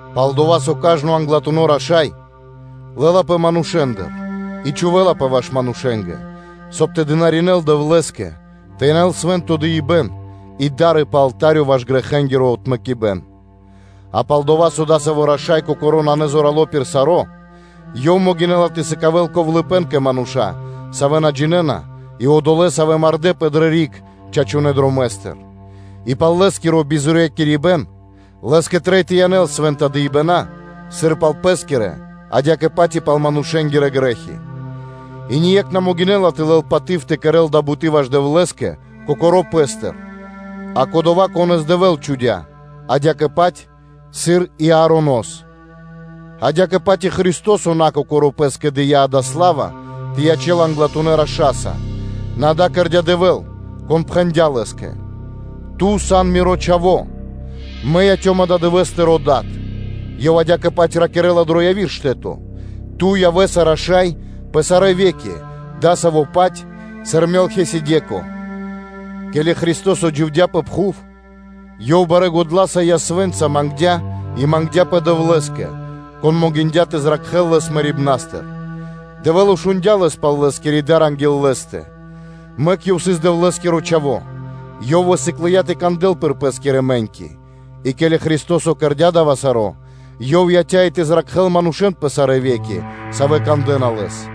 Пал-дова́ со кажно англатуно́ раша́й лэ́лапэ манушэ́ндыр и чхувэ́лапэ ваш манушэ́нгэ, соб (кай) тэ дынаринэ́л Дэвлэ́скэ: тэ янэл свэ́нто дыибэ́н и да́ры пэ алта́рё ваш грэхэнгиро отмэкибэн; а пал-дова́, со адасаво́ раша́й кокоро́ нанэ зорало́ пир саро́, Ёв могинэ́ла тэ сыкавэ́л ковлыпэн кэ мануша́, савэ́ на джинэ́на и одолэ́, савэ́ змардэпэ чачунэ́ дромэ́стыр, и пал лэ́скиро бизорьякирибэн лэ́скэ трэй тэ янэл свэ́нта дыибэна́, сыр пал пэ́скирэ, адя́кэ-паць и пал манушэ́нгирэ грэ́хи. И ние́кх на могинэ́ла (на дэла ра́да) тэ лэл паты́в тэ кэрэ́л дая́ буты́ ваш Дэвлэ́скэ кокоро́ пэ́стыр, а кодова́, конэ́с Дэвэ́л чхудя́, адя́кэ-паць, сыр и Аронос (Аароно́с). Адя́кэ-паць и Христо́со на Кокоро́ Пэ́скэ дыя́ дая́ сла́ва тэ ячэ́л Англатунэ́ Раша́са, нэ дава́ кэрдя́ Дэвэ́л, Кон пхэндя́ Лэ́скэ: “Ту сан Миро Чхаво́, Мэ яцём ададывэ́с Тырэ́ Дадэ́са (Тыро́ Дад).” Ёв адя́кэ-паць ракирэ́ла дро яви́р штэ́то: “Ту явэ́са Раша́й пэ сарэ́ ве́ки, адасаво́-паць пир рашаипэн, сыр Мелхисэдэко сыс.” Ке́ли Христо́со дживдя́ пэ пхув, Ёв барэ́ годла́са и ясвэ́нца мангдя́ и мангдя́пэ Дэвлэ́скэ, Кон могиндя́ тэ зракхэ́л Лэс мэрибна́стыр. Дэвэ́л шундя́ Лэс пал Лэ́скири дар анги́л Лэ́стэ; мэк Ёв сыс Дэвлэ́скиро Чхаво́, Ёв высыклыя тэ кандэл пир Пэ́скирэ мэ́ньки; и ке́ли Христо́со кэрдя́ кэ ко́нцо / яго́ро (сполниндя) дава́ саро́, Ёв яця́ и тэ зракхэ́л манушэ́н пэ сарэ́ ве́ки, савэ́ кандэ́на Лэс,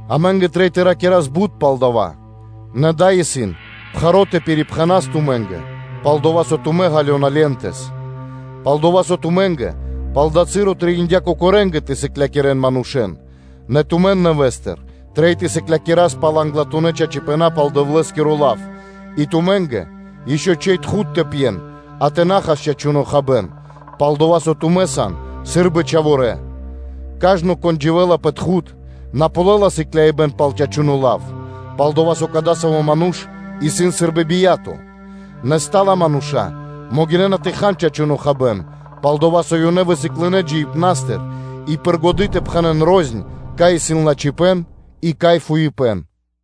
Амэ́нгэ трэй тэ ракирас бут пал дава́, нэ дава́ исын пхаро́ тэ пирипхэнас тумэ́нгэ, пал-дова́ со тумэ́ ґалёна пово́линькэс (насыгэс). Пал-дова́ со тумэ́нгэ пал дава́ часо трэиндя́ кокорэнгэ тэ сыклякирэ́н манушэ́н; нэ тумэн нэвэ́стыр трэй тэ сыклякирас пал англатунэ́ чачипэна́ пал Дэвлэ́скиро лав, и тумэ́нгэ ишчо (инкэ́) трэй тхуд тэ пьен, а тэ на хас чачуно́ хабэ́н, пал-дова́ со тумэ́ сан сы́рбы чхаворэ́. Кажно, кон дживэ́ла пэ тхуд, на ґалёла сыклякирибэ́н пал чачуно́ лав, пал-дова́ со кадасаво́ ману́ш исын сы́рбы бия́то (чхаворо́), нэ стала мануша́ могинэ́на тэ хан чачуно́ хабэ́н, пал-дова́ со ёнэ высыклынэ джиибнастыр и пир годы́ тэ пхэнэ́н рознь, кай исын лачхипэ́н и кай исын фуипэ́н.